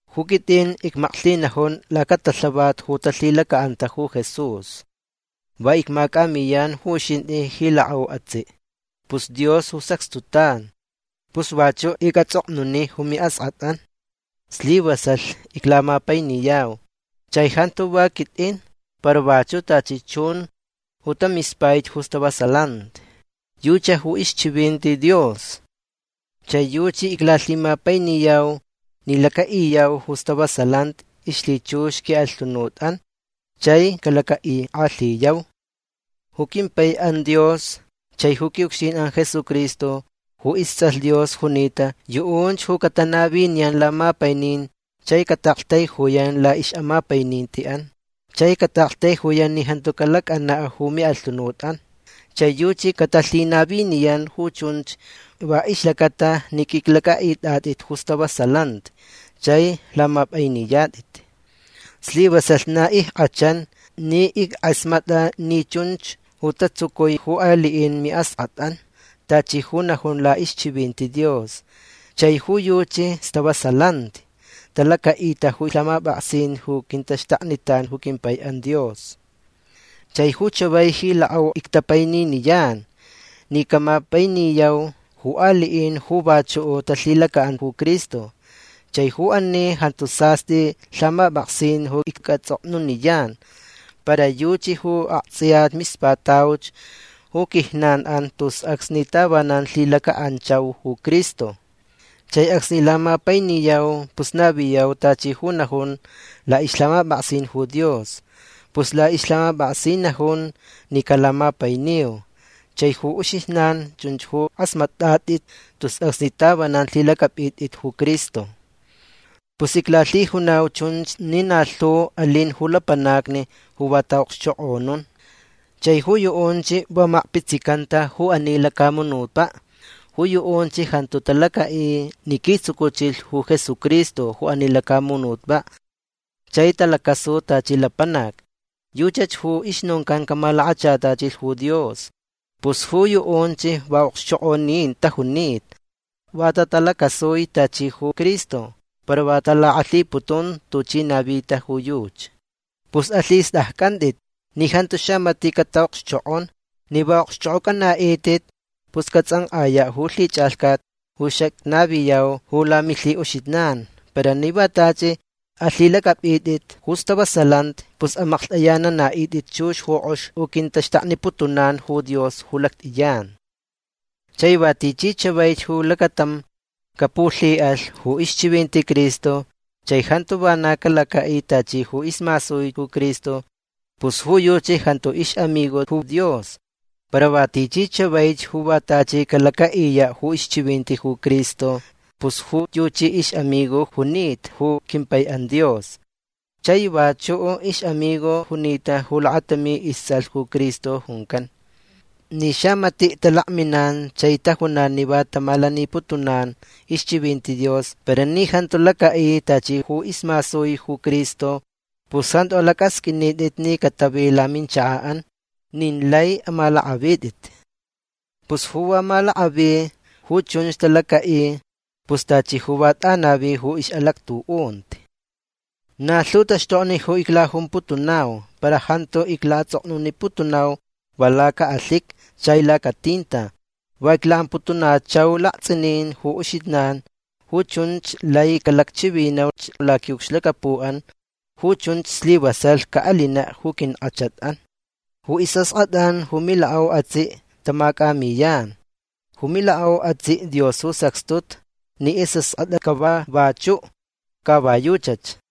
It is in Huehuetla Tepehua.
Ju quit'in icmaklhinajun lacatalhavat ju talhilaca'anta ju Jesús. Va icmac'amiyan ju uxint'i ji lak'au atsi'. Pus Dios ju sacxtutan. Pus vachu' ic'ats'oknuni ju mi'ask'at'an. Slivasalh iclamapainiyau. Chai jantu va quit'in para vachu' tachi chun ju tamispaich ju stavasalanti. Yuchi ju ixchivinti Dios. Chai yuchi iclalhimapainiyau ni laca'iyau ju stavasalanti ixlhichux qui'alhunut'an chai calaca'ik'alhiyau. Ju quimpai'an Dios chai ju qui'ucxtin'an Jesucristo ju ists'alh Dios junita yu'unch ju catanaviniyan lamapainin chai cata'aktaijuyan la'ix'amapaininti'an chai cata'aktaijuyan ni jantu calac'ana' ju mi'alhunut'an. Chai yuchi catalhinaviniyan ju chunch va ixlacata ni q'uiclac'a'it'at'it ju stavasalanti chai lamap'ainiyat'it. Slivasalh na ick'achan ni ick'asmat'a ni chunch ju tatsucui ju ali'in mi'ask'at'an tachi ju najun la'ixchivinti Dios. Chai ju yuchi stavasalanti. Talaca'ita ju lhamap'aksin ju quintaxtaknitan ju quimpai'an Dios. Chai ju chavai ji lak'au ictapaininiyan ni camapainiyau ju ali'in ju vachu' talhilaca'an ju Cristo. Chai ju ani jantu sast'i lhamap'aksin ju ic'ats'oknuniyan. Para yuchi ju akts'iya mispatauch ju quijnan'an tus acsni tavanan lhilaca'anchau ju Cristo. Chai acsni lamapainiyau pus naviyau tachi ju najun la'ixlhamap'aksin ju Dios. Pus la'ixlhamap'aksin najun ni calamapainiu. Chai ju uxijnan chunch ju k'asmat'at'it tus acsni tavanan lhilac'ap'it'it ju Cristo. Pus iclalhijunau chunch ni na lhu alin ju lapanacni ju va ta'a'okxchok'onun. Chai ju yu'unch va makpitsicanta ju ani lacamunutpa'. Ju yu'unch jantu talaca'i ni quitsucuchilh ju Jesucristo ju ani lacamunutpa' chai talacasu tachi lapanac. Yuchach ju ixnoncan camalakachatachilh ju Dios. Pus ju yu'unch va a'okxchok'onin tajunita. Va tatalacasui tachi ju Cristo para va talak'alhiputun tuchi navita ju yuchi. Pus alhist'acc'ant'it ni jantu xamati' cata'okxchok'on. Ni va a'okxch'ok'oc'ana'it'it pus cats'ank'aya' ju lhich'alhcat ju xacnaviyau ju lamilhi'uxijnan. Para ni va tachi alhilac'ap'it'it ju stavasalanti pus amaklht'ayanana'it'it chux ju k'ox ju quintaxtakniputunan ju Dios ju lact'iyan. Chai va tichi chavaich ju lacatam capulhi'alh ju ixchivinti Cristo chai jantu vana calaca'i tachi ju ismasui ju Cristo pus ju yuchi jantu ix'amigo ju Dios. Para va tichi chavaich ju va tachi calaca'iya' ju ixchivinti ju Cristo pus ju yuchi ix'amigo junita ju quimpai'an Dios. Chai vachu' ix'amigo junita ju lakatami ists'alh ju Cristo juncan. Ni xamati' talakminan chai tajunan ni va tamalaniputunan ixchivinti Dios para ni jantu laca'i tachi ju ismasui ju Cristo pus jantu alac'asq'uinit'it ni catavi laminchaka'an. Nin lai amalak'avit'it. Pus ju va malak'avi ju chunch talaca'i pus tachi ju va t'anavi ju ix'alactu'unti. Na lhu taxtokni ju iclajumputunau para jantu icla'ats'oknuniputunau va laca'alhiqui chai lacatinta. Va icla'amputunachau lakts'inin ju uxijnan. Ju chunch lai calacchivinauch laqui'ucxlacapu'an. Ju chunch slivasalh ca'alina' ju quink'achat'an. Ju is'ask'at'an ju milak'au atsi' tamac'amiyan. Ju milak'au atsi' Dios ju sacxtuta ni is'ask'at'a cava vachu'. Ca va yuchach.